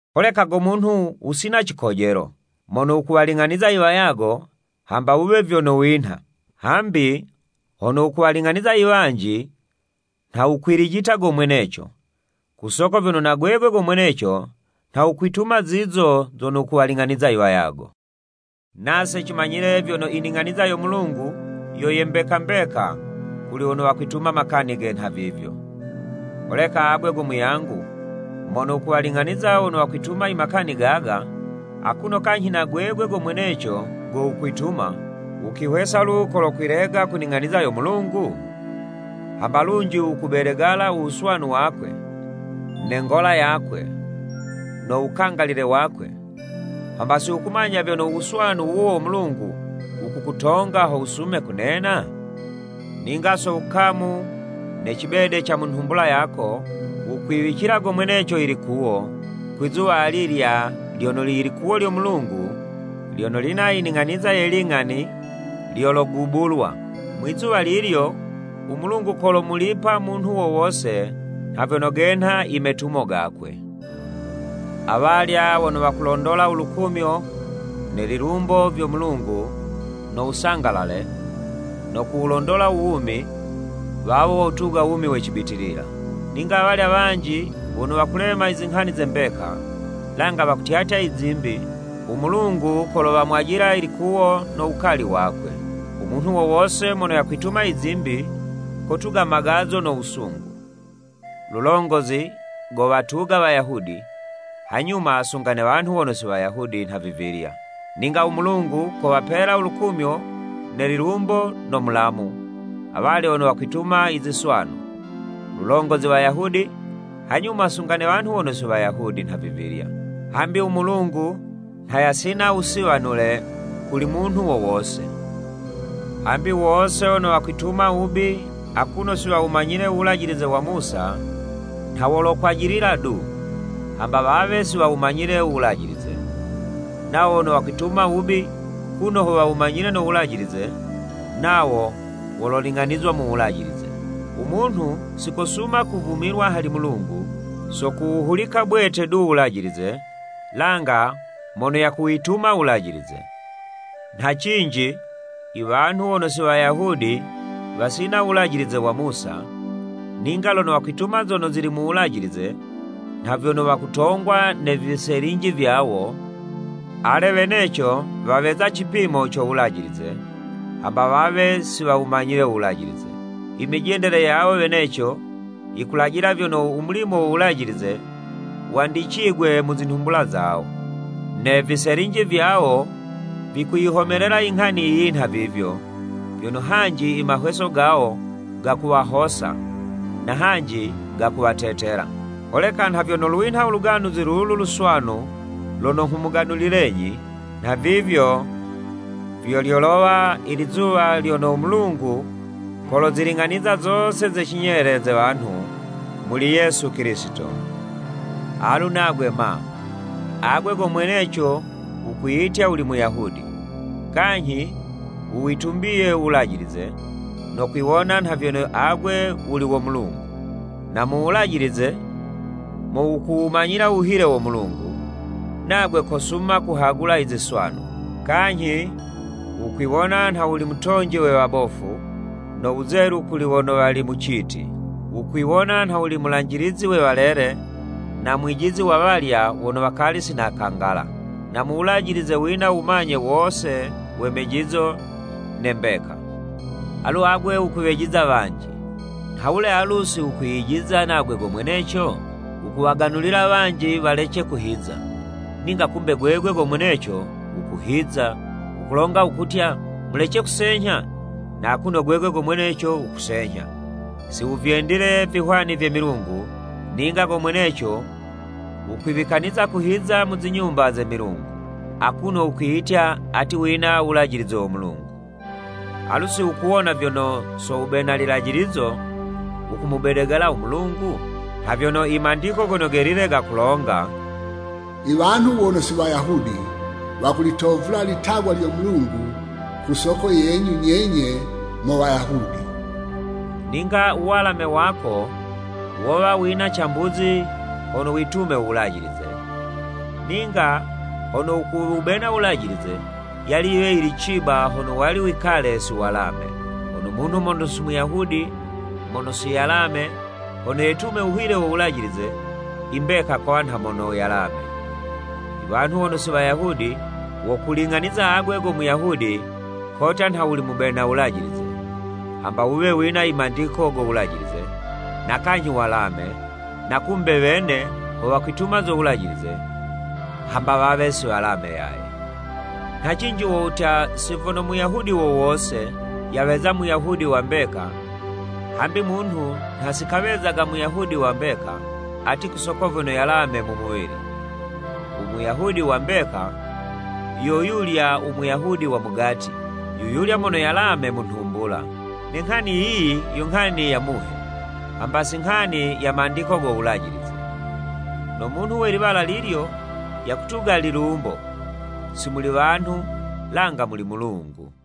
Holeka go munhu, wusina cikojelo, mono wukuwaling'aniza iwayago, hamba wuwe vyono winha. Hambi hono wukuwaling'aniza i wanji, nha wukwilijita go mweneco, ku soko vyono na gwegwe go mweneco, nha wukwituma zizo zono wukuwaling'aniza iwayago. Nase cimanyile vyono, i ning'aniza yo Mulungu yo ye mbeka mbeka kuli wono wakwituma makani ge nhavivyo. Holeka agwe go muyangu mono wukuwalin'aniza wono wakwituma imakani gaga, akuno kanyhi na gwegwe go mweneco go wukwituma, wukwihwesa lu kolokwilega ku ning'aniza yo Mulungu? Hamba lunji wukuwubedegala u wuswanu wakwe, ne ngola yakwe, no wukangalile wakwe, hamba si wukumanya vyono u wuswanu wuwo wo Mulungu, wukukutonga ho wusume kunena? Ninga so wukamu ne cibede ca mu nhumbula yako, wukwiwicila go mweneco ilikuwo, kwi'zuwa alilya lyono ilikuwo lyo Mulungu lyono lina i ning'aniza ye ling'ani lyologubulwa. Mwi'zuwa lilyo, u Mulungu, kolomulipa munhu wo wose nha vyono genha imetumo gakwe. Awalya wono wakulondola u lukumyo ne lilumbo vyo Mulungu no wusangalale, no kuwulondola uwumi, wawo wotuga u wumi we cibitilila. Ninga awalya wanji wono wakulema izinghani ze mbeka, langa wakutyatya izimbi, u Mulungu kolowamwajila ilikuwo no wukali wakwe. U munhu wo wose mono yakwituma izimbi, kotuga magazo no wusungu. Lulongozi gowatuga Wayahudi, hanyuma sunga ne wanhu wono si Wayahudi nhavivilya. Ninga u Mulungu kowapela u lukumyo ne lilumbo no mulamu, awalya wono wakwituma iziswanu, lulongozi Wayahudi, hanyuma sunga ne wanhu wono wi Wayahudi nhavivilya. Hambi u Mulungu nha yasina wusiwanule kuli munhu wo wose. Hambi wose wono wakwituma wubi akuno si wawumanyile u Wulajilize wa Musa, nha wolokwajilila du, hamba wawe si wawumanyile u Wulajilize. Nawo wono wakwituma wubi kuno ho wawumanyile no Wulajilize, nawo wololing'anizwa mu Wulajilize. U munhu, si kosuma kuvumilwa hali Mulungu, so kuwuhulika bwete du Wulajilize, langa mono yakuwituma Wulajilize. Nha cinji, iwanhu wono si Wayahudi, wasina u Wulajilize wa Musa, ninga lono wakwituma zono zili mu Wulajilize, nha vyono wakutongwa ne viselinji vyawo, ale weneco waweza cipimo co Wulajilize, hamba wawe si wawumanyile u Wulajilize. Imijendele yawo weneco, yikulajila vyono u mulimo wo Wulajilize, wandicigwe mu zinhumbula zawo. Ne viselinji vyawo, vikuyihomelela inghani yiyi nhavivyo, vyono hanji imahweso gawo gakuwahosa, na hanji gakuwatetela. Holeka nha vyono lwinha u Luganuzi lulu Luswanu lono nghumuganulilenyi, nhavivyo vyo lyolowa ilizuwa lyono u Mulungu koloziling'aniza zose ze cinyele ze wanhu, muli Yesu Kilisito. Alu nagwe ma, Agwe go mweneco wukwiyitya wuli Muyahudi, kanyhi wuwitumbiye u Wulajilize, no kwiwona nha vyono agwe wuli wo Mulungu, na mu Wulajilize mo wukumanyila u wuhile wo Mulungu, nagwe kosuma kuhagula iziswanu, kanyhi wukwiwona nha wuli mutonji we wabofu, no wuzelu kuli wono wali mu citi, wukwiwona nha wuli mulanjilizi we walele, na mwijizi wa walya wono wakali si nakangala. Na mu Wulajilize, wina wumanye wose we mejizo ne mbeka. Alu agwe wukuwejiza wanji, nha wule alu si wukwiyijiza nagwe go mweneco? Wukuwaganulila wanji walece kuhiza, ninga kumbe gwegwe go mweneco wukuhiza. Wukulonga wukutya, “Mulece kusenyha.” Na akuno gwegwe go mweneco wukusenyha, si wuvyendile vihwani vye milungu, ninga go mweneco wukwiwikaniza kuhiza mu zinyumba ze milungu. Akuno wukwiyitya ati wina u Wulajilize wo Mulungu. Alu si wukuwona vyono, so wubena lilajilizo, wukumubedegala u Mulungu? Nha vyono i Mandiko Gono Gelile gakulonga, “I wanhu wono si Wayahudi wakulitovula ilitagwa lyo Mulungu ku soko yenyu nyenye mo Wayahudi!” Ninga u walame wako wowa wina cambuzi, hono uwitume u Wulajilize. Ninga hono wukuwubena u Wulajilize, yali yiwe yili ciba, hono wali wikale si walame. Hono munhu mono si Muyahudi mono si yalame, hono yetume u wuhile wo Wulajilize, imbeka kowa nha mono yalame. Iwanhu wono si Wayahudi, wokuling'aniza agwe go Muyahudi kotya nha wuli mubena Wulajilize, hamba wuwe wina imandiko go Wulajize, na kanyhi walame, na kumbe wene ho wakwituma zo Wulajilize, hamba wawe si walame yaye. Nha cinji wo wutya, si vyono Muyahudi wo wose, yaweza Muyahudi wa mbeka, hambi munhu nha si kawezaga Muyahudi wa mbeka, ati ku soko vyono yalame mu muwili. U Muyahudi wa mbeka, yo yulya u Muyahudi wa mugati, yuyulya mono yalame mu nhumbula. Ne nghani yiyi, yo nghani ya Muhe, hamba si nghani ya mandiko go Wulajilize. No munhu we liwala lilyo, yakutuga lilumbo, si muli wanhu, langa muli Mulungu.